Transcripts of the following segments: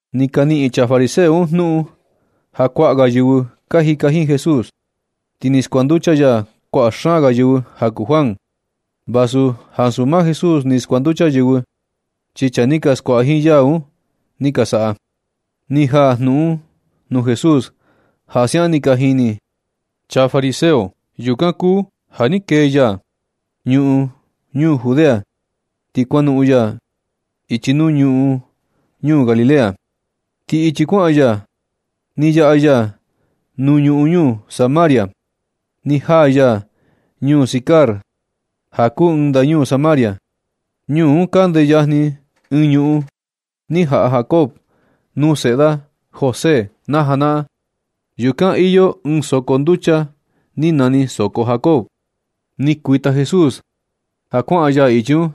Ni ka niꞌin chaa fariseo un jnuꞌun ja kuaꞌa ga yɨvɨ ka jika jiin Jesús, ti ni skuanducha ya kuaꞌa xaan ga yɨvɨ ja kuu Juan. Vasu ansu maa Jesús ni skuanducha yɨvɨ, chi chaa ni ka skuaꞌa jiin ya un ni ka saꞌa. Ni jaa jnuꞌun un nuu Jesús ja siaꞌan ni ka jini chaa fariseo. Yukan kuu ja ni kee ya ñuꞌun ñuu Judea, ti kuanoꞌon ya ichi nuu ñuꞌun ñuu Galilea. Ti ichi kuaꞌan ya ni yaꞌa ya nuu ñuꞌun ñuu Samaria. Ni jaa ya ñuu Sikar ja kuu ɨɨn ndañuu Samaria. Ñuu un kande yajni ɨɨn ñuꞌun ni jaꞌa Jacob nuu seꞌe da José na janaꞌan. Yukan iyo ɨɨn soko nducha ni nani soko Jacob. Ni kuita Jesús ja kuaꞌan ya ichi un,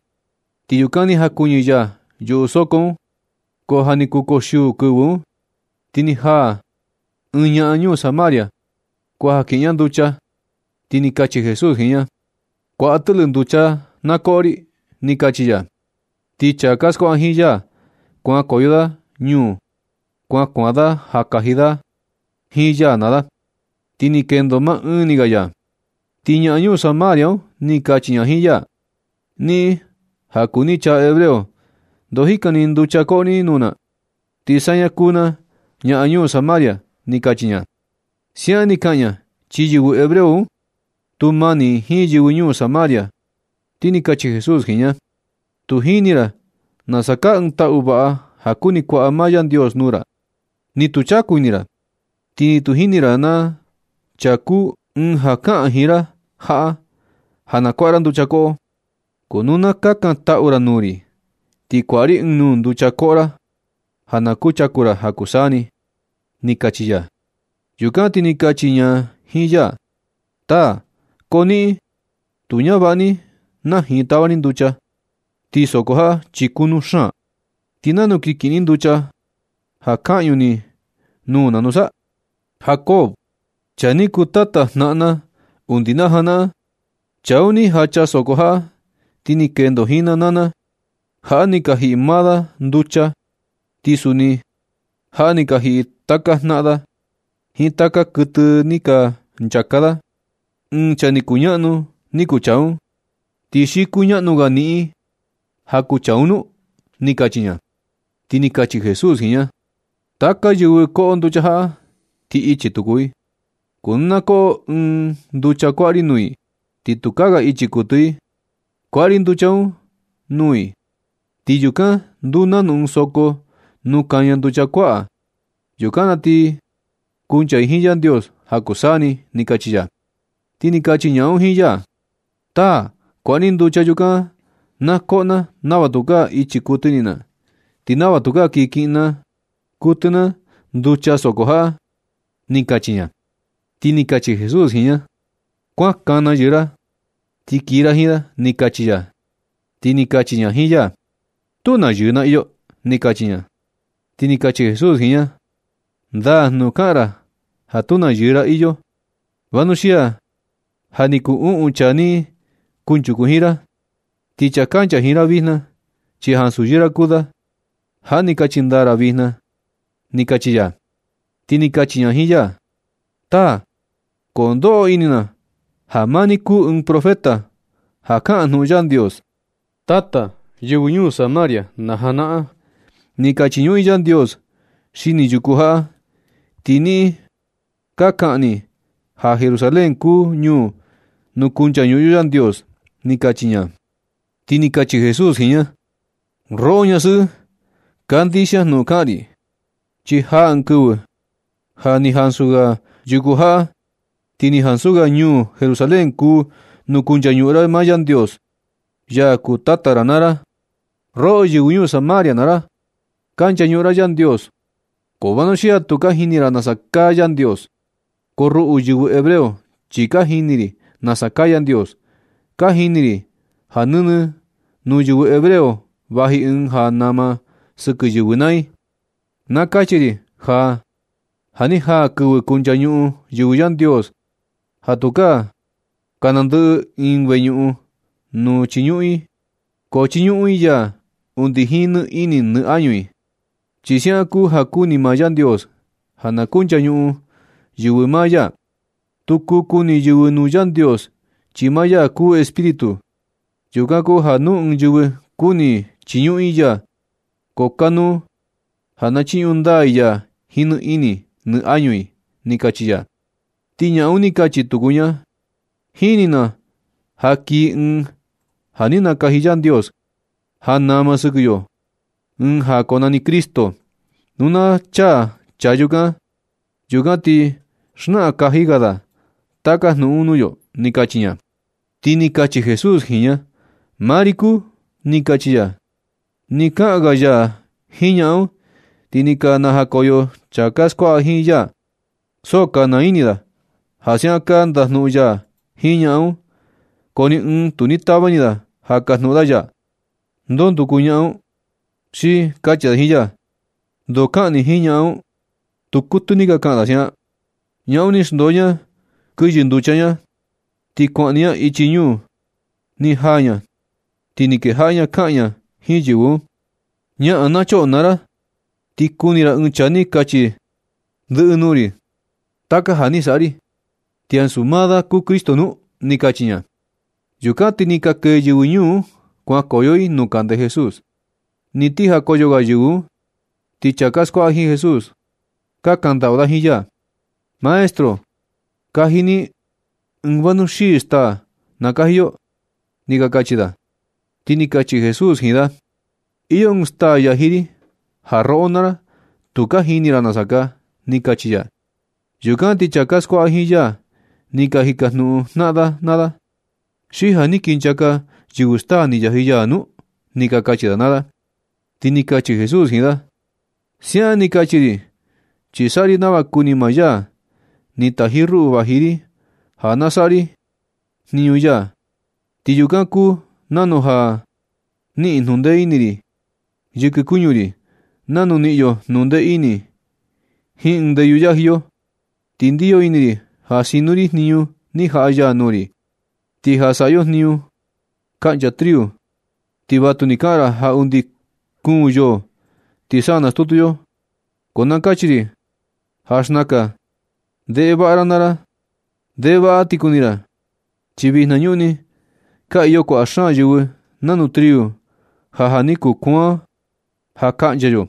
ti yukan ni jakuɨñɨ ya yuꞌu soko un. Ko ja ni kuu koxiuu kɨvɨ un. Ti ni jaa ɨɨn ñaꞌan ñuu Samaria kuaja kiꞌin ña nducha. Ti ni kachi Jesús jiin ña: ―Kuaꞌa tɨꞌlɨ nducha na koꞌo ri ―ni kachi ya. Ti chaa ka skuaꞌa jiin ya, kuankoyo da ñuu un kuan kuaan da ja kaji da jiin ya naa da, ti ni kendo maa ɨɨn ni ga ya. Ti ñaꞌan ñuu Samaria un ni kachi ña jiin ya: ―Niꞌin ja kuu ni chaa hebreo. ¿Ndo jikan ni nducha koꞌo ni nuu na, ti saña kuu na ñaꞌan ñuu Samaria? ―ni kachi ña. Siaꞌan ni kaꞌan ña, chi yɨvɨ hebreo un, tu mani i jiin yɨvɨ ñuu Samaria. Ti ni kachi Jesús jiin ña: ―Tu jini ra nasa kaa ɨɨn taꞌu vaꞌa ja kuni kuaꞌa maa Yandios nuu ra. Ni tu chaku ini ra, ti ni tu jini ra na chaa kuu ɨɨn ja kaꞌan jiin ra jaꞌa ja na kuaꞌa ra nducha koꞌo. Ko nu na kakantaꞌu ra nuu ri, ti kuaꞌa ri ɨɨn nuu nducha koꞌo ra ja na kuchaku ra ja kuu saa ni ―ni kachi ya. Yukan ti ni kachi ña jiin ya: ―Taa. Ko niꞌin, ni tu ñavaꞌa ni najin tava ni nducha. Ti soko jaꞌa chi kunu xaan. ¿Ti nanu kin kiꞌin ni nducha ja kaꞌñu ni nuu na nusa? Jacob chaa ni kuu tata jnaꞌan na undi na janaꞌan. Chaa un ni jacha soko jaꞌa ti ni kendo jiin na naa na. Jaꞌa ni ka jiꞌi maa da nducha, ti suni jaꞌa ni ka jiꞌi taka jnaꞌan da jiin taka kuɨtɨ ni ka nchaka da. Ɨɨn chaa ni kuñaꞌnu ni kuu chaa un, ¿ti xi kuñaꞌnu ga niꞌin ja kuu chaa un nu? ―ni kachi ña. Ti ni kachi Jesús jiin ña: ―Taka yɨvɨ koꞌo nducha jaꞌa, ti ichi tuku i. Ko nu na koꞌo i ɨɨn nducha kuaꞌa ri nuu i, ti tukaa ga ichi kuɨtɨ i. Kuaꞌa ri nducha un nuu i, ti yukan nduu nanu ɨɨn soko nuu kaña nducha kuaꞌa. Yukan na ti kuncha i jiin Yandios ja kuu saa ni ―ni kachi ya. Ti ni kachi ñaꞌan un jiin ya: ―Taa. Kuaꞌa ni nducha yukan, na koꞌo na nava tukaa ichi kuɨtɨ na, ti nava tukaa kii kiꞌin kuɨtɨ na nducha soko jaꞌa ―ni kachi ña. Ti ni kachi Jesús jiin ña: ―Kuan kana yɨɨ ra ti kii ra jiin da ―ni kachi ya. Ti ni kachi ña jiin ya: ―Tu na yɨɨ na iyo ―ni kachi ña. Ti ni kachi Jesús jiin ña: ―Ndaa jnuꞌun kaꞌan ra ja tu na yɨɨ ra iyo, vanuxia, ja ni kuu uꞌun chaa ni kunchuku jiin ra, ti chaa kancha jiin ra vijna chi ansu yɨɨ ra kuu da. Jaꞌa ni kachi ndaa ra vijna ―ni kachi ya. Ti ni kachi ña jiin ya: ―Taa. Ko ndoꞌo ini na ja maa ni kuu ɨɨn profeta ja kaꞌan jnuꞌun Yandios. Tata yɨvɨ ñuu Samaria na janaꞌan, ni ka chiñuꞌun i Yandios xini yuku jaꞌa. Ti niꞌin ka kaꞌan ni ja Jerusalén kuu ñuu nuu kunchañuꞌun yo Yandios ―ni kachi ña. Ti ni kachi Jesús jiin ña: ―Roꞌo ñasɨꞌɨ. Kandixia jnuꞌun kaꞌan ri. Chi jaa ɨɨn kɨvɨ ja ni ansu ga yuku jaꞌa, ti ni ansu ga ñuu Jerusalén kuu nuu kunchañuꞌun ra maa Yandios, ya kuu Tata ra naa ra. Roꞌo yɨvɨ ñuu Samaria naa ra, ka nchañuꞌun ra Yandios, ko vanuxia tu ka jini ra nasa kaa Yandios. Ko ruꞌu yɨvɨ hebreo chi ka jini ri nasa kaa Yandios, ka jini ri ja nɨnɨ nuu yɨvɨ hebreo vaji Ɨɨn ja nama sɨkɨ yɨvɨ naa i. Na kachi ri ja, ja ni jaa kɨvɨ kunchañuꞌun yɨvɨ Yandios, ja tukaa ka nandɨꞌɨ ɨɨn ni veñuꞌun nuu chiñuꞌun i ga. Ko chiñuꞌun i ya undi jiin nɨ ini nɨ añu i. Chi siaꞌan kuu ja kuni maa Yandios ja na kunchañuꞌun yɨvɨ maa ya. Tu kuu kuni yɨvɨ nuu Yandios, chi maa ya kuu Espíritu. Yukan kuu ja nu ɨɨn yɨvɨ kuni i chiñuꞌun i ya, ko kanuu ja na chiñuꞌun ndaa i ya jiin nɨ ini nɨ añu i ―ni kachi ya. Ti ñaꞌan un ni kachi tuku ña: ―Jini na ja kii ɨɨn ja ni nakaji Yandios ja nama sɨkɨ yo, ɨɨn ja konani Cristo. Nu na chaa chaa yukan, yukan ti xnaꞌan kaji ga da taka jnuꞌun un nuu yo ―ni kachi ña. Ti ni kachi Jesús jiin ña: ―Maa ri kuu ―ni kachi ya. Nɨ kaꞌan ga ya jiin ñaꞌan un, ti ni ka najakoyo chaa ka skuaꞌa jiin ya. So ka naa ini da ja siaꞌan ka ndajnuꞌun ya jiin ñaꞌan un. Ko ni ɨɨn tu ni ka tava ini da ja kajnuꞌun da ya: “¿Ndo nduku ñaꞌan un?” Xi kachi da jiin ya: “¿Na ndoo kaꞌan ni jiin ñaꞌan un?” Tu kuɨtɨ ni ka kaꞌan da siaꞌan. Ñaꞌan un ni xndoo ña kɨyɨ nducha ña ti kuaꞌan ni ña ichi ñuu. Ni jaa ña ti ni kejaꞌa ña kaꞌan ña jiin yɨvɨ un: ―¡Ñaꞌan na choꞌo naa ra, ti kuni ra ɨɨn chaa ni kachi ndɨꞌɨ nuu ri taka ja ni saꞌa ri! ¿Ti ansu maa da kuu Cristo nu? ―ni kachi ña. Yukan ti ni ka kee yɨvɨ ñuu un kuankoyo i nuu kande Jesús. Ni ti jakoyo ga yɨvɨ un, ti chaa ka skuaꞌa jiin Jesús, ka kandaꞌu da jiin ya: ―Maestro, kaji ni ɨɨn vanuxii staa, na kaji yo ―ni ka kachi da. Ti ni kachi Jesús jiin da: ―Iyo ɨɨn staa yaji ri ja roꞌo naa ra, tu ka jini ra nasa kaa ―ni kachi ya. Yukan ti chaa ka skuaꞌa jiin ya ka jikajnuꞌun jnaꞌan da naa da: ―¿Xi ja ni ka kinchaka yɨvɨ staa ni yaji ya nu? ―ni ka kachi da naa da. Ti ni kachi Jesús jiin da: ―Siaꞌan ni kachi ri, chi saꞌa ri nava kuni maa ya ni taji ruꞌu vaji ri ja na saꞌa ri jniñu ya. Ti yukan kuu nanu ja na niꞌin jnuꞌun ndee ini yɨkɨ kuñu ri, nanu niꞌin yo jnuꞌun ndee ini jiin ɨɨn ndeyu yaji yo. Ti ndiyo ini ri ja sinu ri jniñu ni jaꞌa ya nuu ri. Ti ja saꞌa yo jniñu kaꞌncha triu, ti vatu ni ka kaꞌan ra ja undi kuun yoo ti sa nastutu yo. Ko na kachi ri ja xnaka ndeꞌe vaꞌa ra naa ra, ndeꞌe vaꞌa ti kuni ra, chi vinañuꞌni ka iyo kuaꞌa xaan yɨvɨ nanu triu ja, ja ni kuaan ja kaꞌncha yo,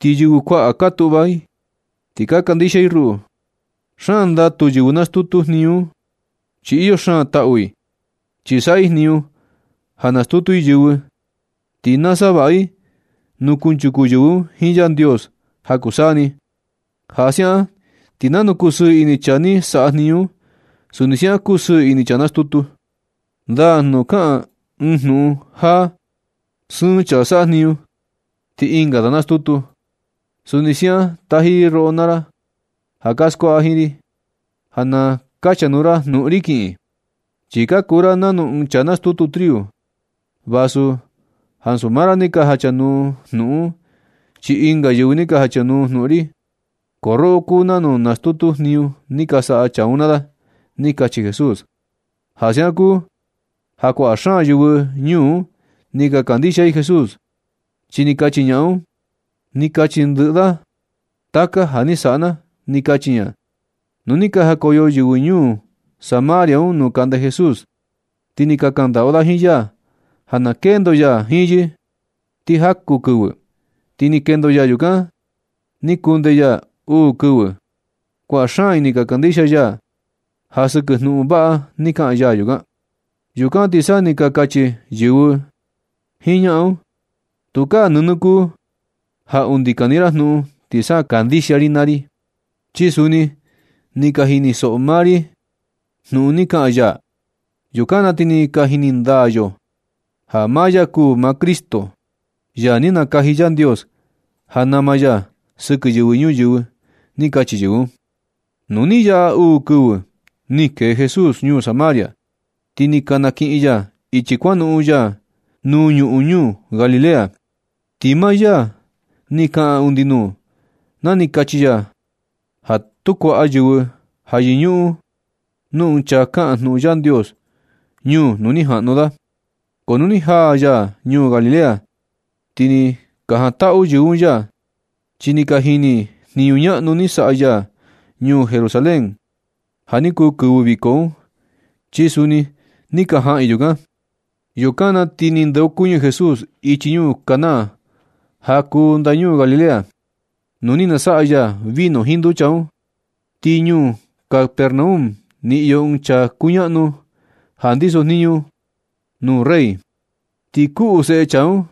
chi yɨvɨ kuaꞌa ka tuꞌva i ti ka kandixia i ruꞌu. Xaan ndatu yɨvɨ nastutu jniñu un chi iyo xaan taꞌu i, chi saꞌa i jniñu ja nastutu i yɨvɨ, ti nasavaꞌa i nuu kunchuku yɨvɨ un jiin Yandios ja kuu saa ni. Ja siaꞌan ti nanu kusɨɨ ini chaa ni saꞌa jniñu un, suni siaꞌan kusɨɨ ini chaa nastutu. Ndaa jnuꞌun kaꞌan ɨɨn jnuꞌun, ja “Sɨɨn chaa saꞌa jniñu, ti ɨnga da nastutu.” Suni siaꞌan taji ri roꞌo naa ra ja ka skuaꞌa jiin ri, ja na kachanuu ra jnuꞌun ri kiꞌin. Chi ka kuu ra nanu ɨɨn chaa nastutu triu. Vasu ansu maa ra ni ka jachanuu jnuꞌun un, chi ɨnga yɨvɨ ni ka jachanuu jnuꞌun ri, ko roꞌo kuu nanu nastutu jniñu ni ka saꞌa chaa un naa da ―ni kachi Jesús. Ja siaꞌan kuu ja kuaꞌa xaan yɨvɨ ñuu un ni ka kandixia i Jesús, chi ni kachi ñaꞌan un: “Ni kachi ndɨꞌɨ da taka ja ni saꞌa na”, ni kachi ña. Nu ni ka jakoyo yɨvɨ ñuu Samaria un nuu kande Jesús, ti ni ka kaꞌan ndaꞌu i jiin ya ja na kendo ya jiin yɨ ti jaku kɨvɨ. Ti ni kendo ya yukan ni kundee ya uu kɨvɨ. Kuaꞌa xaan i ni ka kandixia ya ja sɨkɨ jnuꞌun vaꞌa ni kaꞌan ya yukan. Yukan na ti sa ni ka kachi yɨvɨ jiin ñaꞌan un: ―Tukaa nɨnɨ kuu ja undi kani ra jnuꞌun ti sa kandixia ri ya, chi suni ni ka jinisoꞌo maa ri jnuꞌun ni kaꞌan ya. Yukan na ti ni ka jini ndaa yo ja maa ya kuu maa Cristo, ya ni nakaji Yandios ja nama ya sɨkɨ yɨvɨ ñuyɨvɨ ―ni ka kachi yɨvɨ un. Nu ni yaꞌa uu kɨvɨ, ni kee Jesús ñuu Samaria, ti ni nakiꞌin ya ichi kuanoꞌon ya nuu ñuꞌun ñuu Galilea. Ti maa ya ni kaꞌan undi nuu, na ni kachi ya ja tu kuaꞌa yɨvɨ ja yɨñuꞌun nuu ɨɨn chaa kaꞌan jnuꞌun Yandios, ñuu nuu ni jaꞌnu da. Ko nu ni jaa ya ñuu Galilea, ti ni ka jantaꞌu yɨvɨ un ya, chi ni ka jini i jniñu ñaꞌnu ni saꞌa ya ñuu Jerusalén ja ni kuu kɨvɨ viko un, chi suni ni ka jaꞌan i yukan. Yukan na ti ni ndeokuñɨ Jesús ichi ñuu Caná ja kuu ndañuu Galilea, nuu ni nasaꞌa ya vino jiin nducha un. Ti ñuu Capernaum ni iyo ɨɨn chaa kuñaꞌnu ja ndiso jniñu da nuu rey. Ti kuꞌu seꞌe chaa un.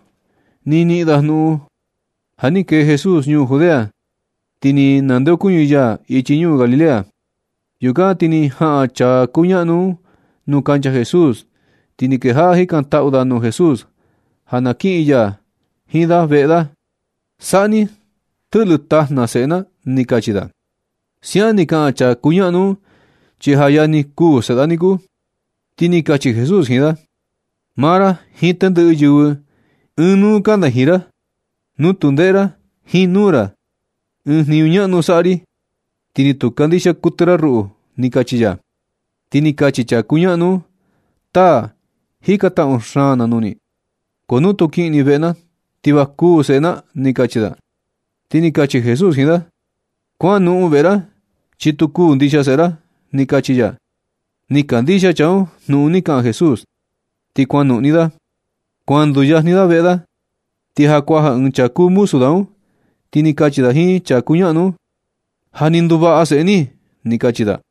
Ni niꞌin da jnuꞌun ja ni kee Jesús ñuu Judea, ti ni nandeokuñɨ ya ichi ñuu Galilea. Yukan ti ni jaꞌan chaa kuñaꞌnu un nuu kancha Jesús, ti ni kejaꞌa jikantaꞌu da nuu Jesús ja na kiꞌin ya jiin da veꞌe da: ―Saꞌa ni tɨꞌlɨ tajna seꞌe na ―ni kachi da. Siaꞌan ni kaꞌan chaa kuñaꞌnu un chi ja yajni kuū seꞌe da niku. Ti ni kachi Jesús jiin da: ―Maa ra jiin tendɨꞌɨ yɨvɨ ɨɨn nuu kanda jiin ra, nu tu ndeꞌe ra jiin nuu ra ɨɨn jniñu ñaꞌnu saꞌa ri, ti ni tu kandixia kuɨtɨ ra ruꞌu ―ni kachi ya. Ti ni kachi chaa kuñaꞌnu un: ―Taa. Jikantaꞌu xaan na nuu ni. Ko nu tu kiꞌin ni veꞌe na, ti va kuū seꞌe na ―ni kachi da. Ti ni kachi Jesús jiin da: ―Kuanoꞌon veꞌe ra chi tu kuū ndixia seꞌe ra ―ni kachi ya. Ni kandixia chaa un jnuꞌun ni kaꞌan Jesús, ti kuanoꞌon ni da. Kuan nduyajni da veꞌe da, ti ja kuaja ɨɨn chaa kuū muzu da un, ti ni kachi da jiin chaa kuñaꞌnu un: ―Ja ni nduvaꞌa seꞌe ni ―ni kachi da.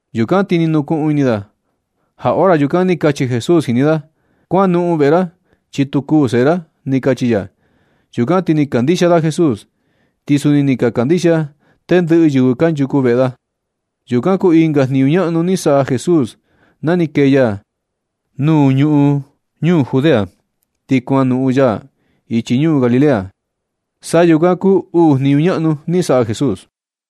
Yukan ti ni nukuꞌun ini da ja hora yukan ni kachi Jesús jini da: “Kuanoꞌon veꞌe ra, chi tu kuu seꞌe ra”, ni kachi ya. Yukan ti ni kandixia da Jesús, ti suni ni ka kandixia tendɨꞌɨ yɨvɨ kanchuku veꞌe da. Yukan kuu ɨnga jniñu ñaꞌnu ni saꞌa Jesús na ni kee ya nuu ñuꞌun ñuu Judea ti kuanoꞌon ya ichi ñuu Galilea. Sa yukan kuu uu jniñu ñaꞌnu ni saꞌa Jesús.